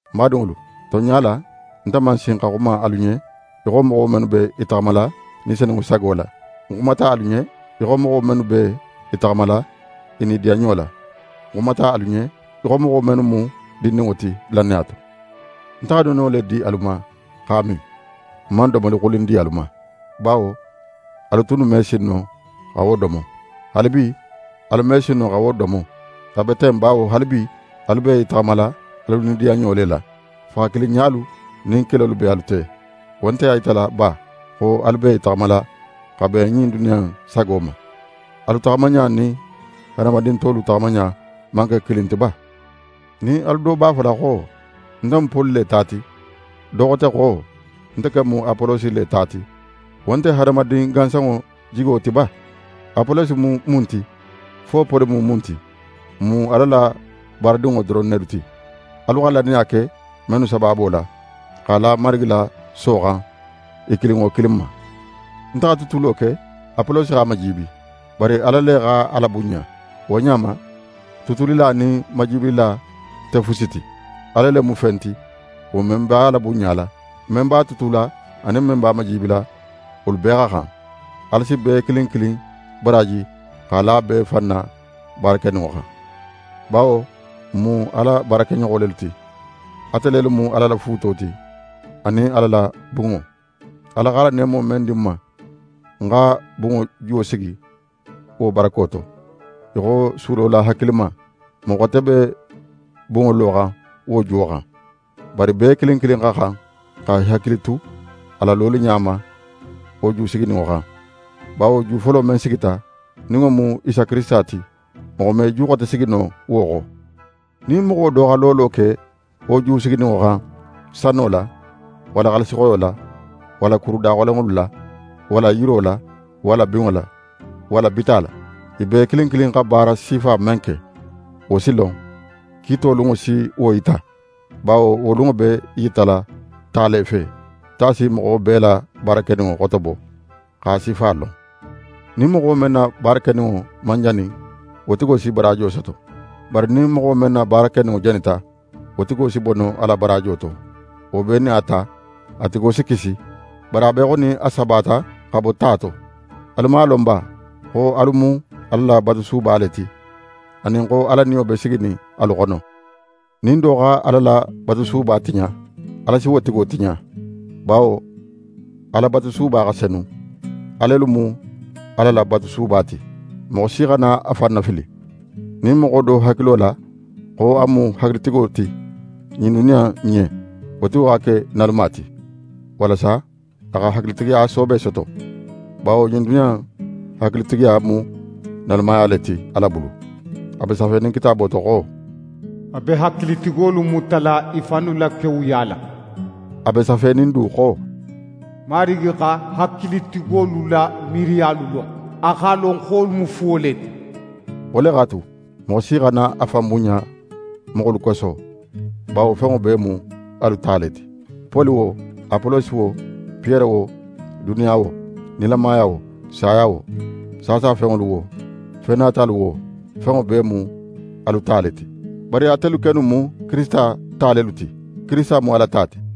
Ń badinŋolu, tonɲa la nte man sin xa xuma alu ɲen í xo moxo mennu be i taxamala Ni Senunŋo sago la, ń xumata alu ɲen ne í xo moxolu mennu b'e taxamala i nidiyanɲo la. Ń xumata alu ɲen í xo moxo mennu mu dindinŋo ti lannaya to. Nte xa nono le di alu ma x'a min, ń man domoli xulin di alu ma, bawo alu tunnu me sin no xa wo domo. Haalibi, alu me sin no xa wo domo. A be ten bawo haalibi, alu be i taxamala alu nidiyanɲo le la. Faxakilinɲalu nin kelolu be alu te; wo nte a yitala ba xo alu be i taxamala xa ben ɲin duniya in sago ma? Alu taxamaɲa nin hadamadin tolu taxamaɲa man ke kilin ti ba? Nin alu do b'a fola xo: «Nte mu Poli le ta ti», do xote xo: «Nte ken mu Apolosi le ta ti», wo nte hadamadin gansanŋo jigo ti ba? Apolosi mu mun ti, fo Poli mu mun ti? N mu Ala la baaradinŋo doron nelu ti, alu xa lannaya ke mennu sabaabo la, x'a la Marigi la so xan i kilin wo kilin ma. Nte xa tutulo ke, Apolosi x'a majiibi, bari Ala le x'a labunɲa. Wo ɲa ma, tutulila nin majiibilila nte fusi ti. Ala le mu fen ti, wo men b'a labunɲala. Men b'a tutula, anin men b'a majibila, wolu bee xa xan. Ala si bee kilin kilin baraaji x'a la bee fan na baara keninŋo xan. Bawo n mu Ala baarakeɲoxo lelu ti. Ate lelu mu Ala la fuuto ti, anin Ala la bunŋo. Ala x'a la neemo men di ń ma, ń xa bunŋo juwo sigi wo barako to, í xo sulola hakilima. Moxo xote be bunŋo loxan wo juwo xan. Bari bee kilin kilin xa xan xa í hakili tu a la loliɲa ma wo ju sigininŋo xan. Bawo ju folo men sigita, nin wo mu Isa Kirisita ti, moxo me ju xote sigi no wo xo. Nin moxo do xa lolo ke wo ju sigininŋo xan, sano la, walla xaalisixoyo la, walla kuru daxolenŋolu la, walla yiro la, walla binŋo la, walla bita la, i bee kilin kilin xa baara sifa men ke, wo si lon. Kiito lunŋo si wo yita, bawo wo lunŋo be í yitala ta le fe. Ta si moxo bee la baara keninŋo xotobo x'a sifa lon. Nin moxo men na baara keninŋo man jani, wo tigo si baraajo soto. Bari nin moxo men na baara keninŋo janita, wo tigo si bono a la baraajo to. Wo bee nin a ta, a tigo si kisi, bari a be í xo nin a sabata xa bo ta to. Alu man a lon ba, xo alu mu Ala la batusuba le ti, anin xo Ala Niyo be siginin alu xono? Nin do xa Ala la batusuba tiɲa, Ala si wo tigo tiɲa; bawo Ala batusuba xa senu. Alelu mu a la batusuba ti. Moxo si xana a fan nafili. Nin moxo do hakilo la xo a mu hakilitigo ti ɲin duniya in ɲen, wo tigo xa ke naluma ti, walasa a xa hakilitigiya soobe soto. Bawo ɲin duniya in hakilitigiya mu nalumaya le ti Ala bulu. A be safenin Kitaabo to xo: «A be hakilitigolu mutala i fannu la kewuya la.» A be safenin du xo: «Marigi xa hakilitigolu la miiriyalu lon. A x'a lon xo wolu mu fuwo le ti.» Wo le x'a tu, moxo si xana a fan bunɲa moxolu koso, bawo fenŋo bee mu alu ta le ti. Poli wo, Apolosi wo, Piyere wo, duniya wo, nilamaya wo, saya wo, saasa fenŋolu wo, fen natalu wo, fenŋo bee mu alu ta le ti. Bari atelu kennu mu Kirisita ta lelu ti. Kirisita mu Ala ta ti.